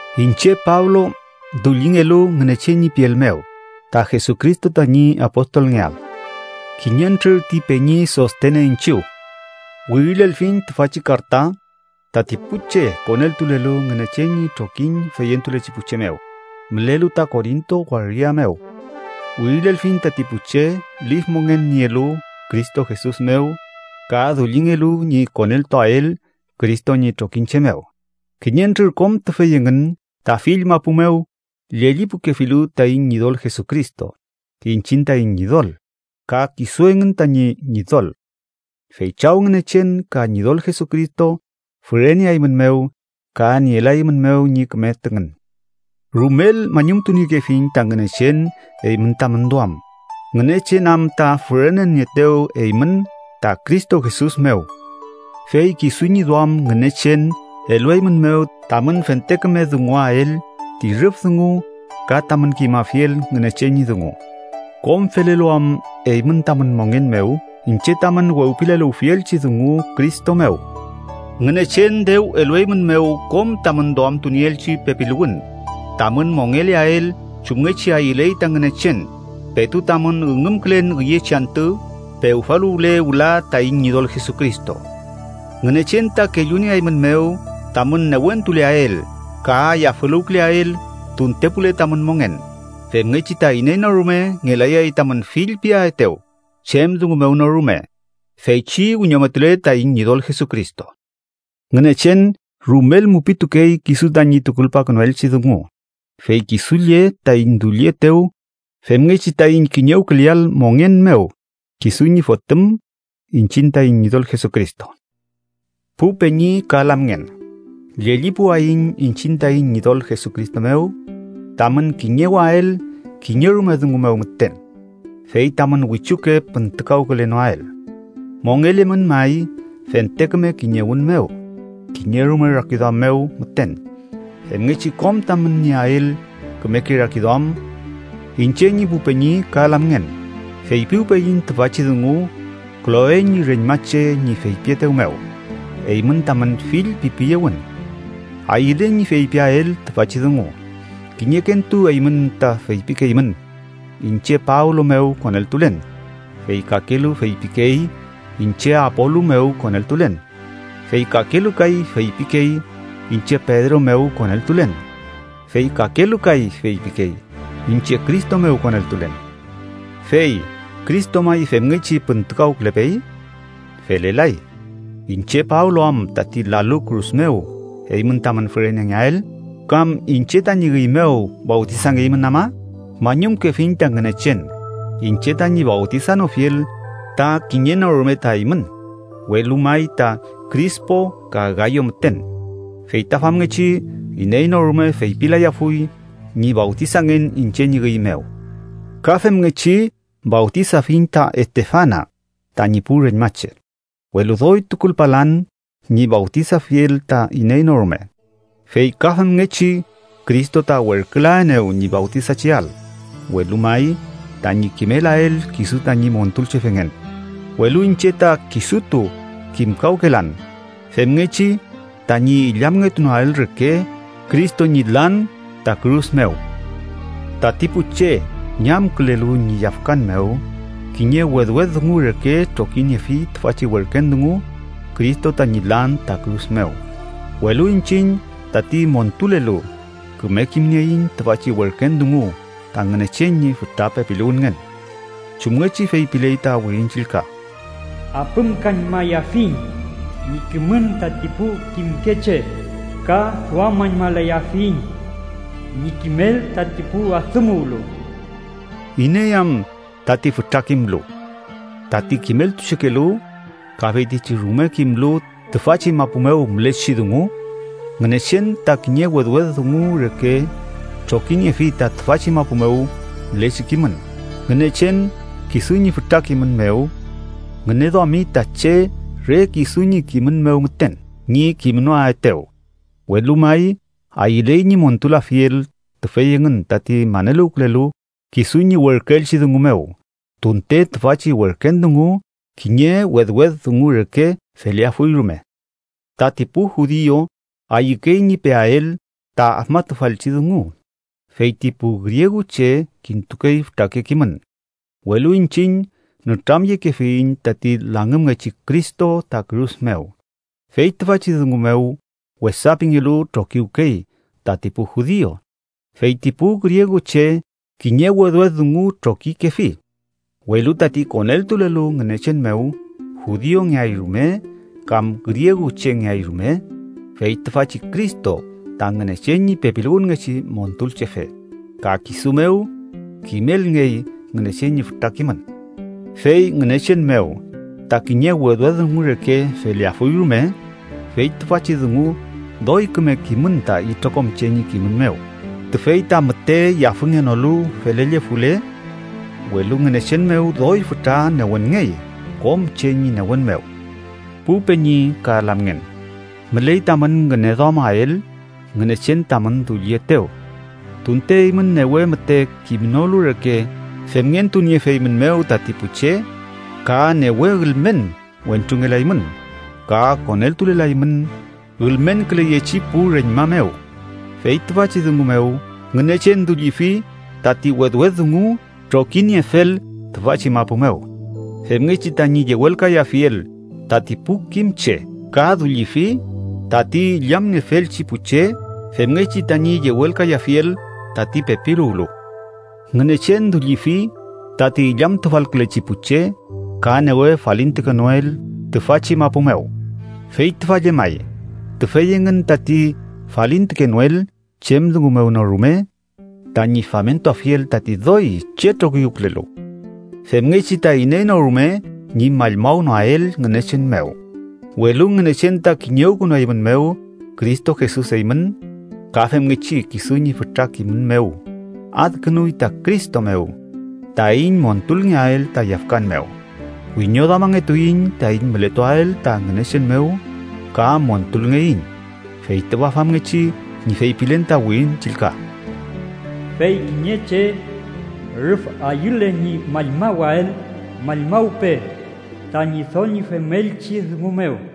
Iñche Pablo, dullingelu Ngünechen ñi piel mew ta Jesucristo tañi apostolngeael, kiñentrür ti peñi Sostene iñchiw, wirilelfiñ tüfachi karta tati pu che koneltulelu Ngünechen ñi trokiñ feyentulechi pu che mew, mülelu ta Korinto waria mew. Wirilelfiñ tati pu che lif mongen nielu Cristo Jesus mew ka dullingelu ñi koneltuael Cristo ñi trokiñche mew, kiñentrür kom tüfey engün ta fill mapu mew llellipukefilu taiñ Ñidol Jesucristo, iñchiñ taiñ Ñidol, ka kisu engün tañi Ñidol. Fey Chaw Ngünechen ka Ñidol Jesucristo füreneaeymünmew ka nielaeymünmew ñi küme tüngün. Rumel mañumtuniekefiñ ta Ngünechen eymün tamün duam, Ngünechen am ta fürenenieetew eymün ta Cristo Jesus mew. Fey kisu ñi duam Ngünechen elueymünmew tamün fente küme dunguael ti rüf dungu ka tamün kimafiel Ngünechen ñi dungu, kom felelu am eymün tamün mongen mew iñche tamün wewpileluwfielchi dungu Cristo mew. Ngünechen dew elueymünmew kom tamün duamtunieelchi pepiluwün tamün mongeleael chumngechi ayüley ta Ngünechen petu tamün üngümkülen üyechi antü pewfaluwale wüla taiñ Ñidol Jesucristo. Ngünechen ta kellunieeymünmew tamün newentuleael ka yafüluwküleael tuntepule tamün mongen, femngechi ta iney no rume ngelayay tamün fillpiaetew chem dungu mew no rume, feychi wiñometule taiñ Ñidol Jesucristo. Ngünechen rumel mupitukey kisu tañi tukulpakünuelchi dungu, fey kisu lle taiñ dullietew femngechi taiñ kiñewküleael mongen mew kisu ñi Fotüm, iñchiñ taiñ Ñidol Jesucristo. Pu peñi ka lamngen, llellipuwayiñ iñchiñ taiñ Ñidol Jesucristo mew tamün kiñewael kiñerume dungu mew müten fey tamün wichuke püntükawkülenoael. Mongelemün may fente küme kiñewün mew kiñerume rakiduam mew müten, femngechi kom tamün nieael kümeke rakiduam. Iñche ñi pu peñi ka lamngen, feypiwpeyiñ tüfachi dungu, Kloe ñi reñmache ñi feypietew mew eymün tamün fillpipiyewün. Ayülen ñi feypiael tüfachi dungu: kiñekentu eymün ta feypikeymün: “Iñche Pablo mew koneltulen”, fey kakelu feypikey: “Iñche Apolu mew koneltulen”, fey kakelu kay feypikey: “Iñche Pedro mew koneltulen”, fey kakelu kay feypikey: “Iñche Cristo mew koneltulen”. ¿Fey Cristo may femngechi püntükawkülepey? Felelay. ¿Iñche Pablo am tati lalu kürus mew eymün tamün fürenengeael? ¿Kam iñche tañi üy mew fawtisangeymün ama? Mañumkefiñ ta Ngünechen iñche tañi fawtisanofiel ta kiñe no rume ta eymün, welu may ta Krispo ka Gayo müten. Fey ta famngechi iney no rume feypilayafuy ñi fawtisangen iñche ñi üy mew. Ka femngechi fawtisafiñ ta Estefana tañi pu reñmache, welu doy tukulpalan ñi fawtisafiel ta iney no rume. Fey ka femngechi Cristo ta werkülaenew ñi fawtisacheael, welu may tañi kimelael kisu tañi Montulchefengen, welu iñche ta kisutu kimkawkelan, femngechi tañi illamngetunoael reke Cristo ñi lan ta kürus mew. Tati pu che ñamkülelu ñi yafkan mew kiñe wedwed dungu reke trokiniefi tüfachi werken dungu Cristo tañi lan ta kürus mew, welu iñchiñ, tati montulelu, küme kimnieiñ tüfachi werken dungu ta Ngünechen ñi fütra pepiluwünngen, chumngechi feypiley ta Wirin Chillka: “Apümkañmayafiñ ñi kimün tati pu kimke che, ka duamüñmalayafiñ ñi kimel tati pu adümuwlu.” ¿Iney am tati fütra kimlu, tati kimeltuchekelu ka feytichi rume kimlu tüfachi mapu mew mülechi dungu? ¡Ngünechen ta kiñe wedwed dungu reke trokiniefi ta tüfachi mapu mew mülechi kimün! Ngünechen, kisu ñi fütra kimün mew, ngüneduami ta che re kisu ñi kimün mew müten ñi kimnoaetew, welu may, ayüley ñi montulafiel tüfey engün tati maneluwkülelu kisu ñi werküelchi dungu mew, tunte tüfachi werken dungu kiñe wedwed dungu reke feleafuy rume. Tati pu judiu ayükey ñi peael ta afmatufalchi dungu, fey ti pu grieguche kintukey fütrake kimün, welu iñchiñ nütramyekefiyiñ tati langümngechi Cristo ta kürus mew. Fey tüfachi dungu mew wesa pingelu trokiwkey tati pu judiu, fey ti pu grieguche kiñe wedwed dungu trokikefi. Welu tati koneltulelu Ngünechen mew, judiungeay rume kam grieguchengeay rume, fey tüfachi Cristo ta Ngünechen ñi pepiluwünngechi Montulchefe ka kisu mew kimelngey Ngünechen ñi fütra kimün. Fey Ngünechen mew ta kiñe wedwed dungu reke feleafuy rume, fey tüfachi dungu doy küme kimün ta itrokom che ñi kimün mew, tüfey ta müte yafüngenolu felellefule, welu Ngünechen mew doy fütra newenngey kom che ñi newen mew. Pu peñi ka lamngen, müley tamün ngüneduamael Ngünechen tamün dullietew, tunte eymün newe müte kimnolu reke femngentuniefeymünmew tati pu che, ka newe ülmen wentrungelaymün ka koneltulelaymün ülmenküleyechi pu reñma mew. Fey tüfachi dungu mew, Ngünechen dullifi tati wedwed dungu trokiniefel tüfachi mapu mew, femngechi tañi yewelkayafiel tati pu kim che, ka dullifi tati illamniefelchi pu che, femngechi tañi yewelkayafiel tati pepiluwlu. Ngünechen dullifi tati illamtufalkülechi pu che ka newe falintukenoel tüfachi mapu mew, fey tüfa llemay: tüfey engün tati falintukenoel chem dungu mew no rume tañi famentuafiel tati doy chetrokiwkülelu. Femngechi ta iney no rume ñi mallmawnoael Ngünechen mew. Welu Ngünechen ta kiñewkünueymünmew Cristo Jesus eymün ka femngechi kisu ñi fütra kimün mew adkünuy ta Cristo mew taiñ montulngeael ta yafkan mew, wiñoduamangetuiñ taiñ mületuael ta Ngünechen mew ka montulngeiñ. Fey tüfa famngechi ñi feypilen ta Wirin Chillka: “Fey kiñe che rüf ayüle ñi mallmawael, mallmawpe ta Ñidol ñi femelchi dungu mew.”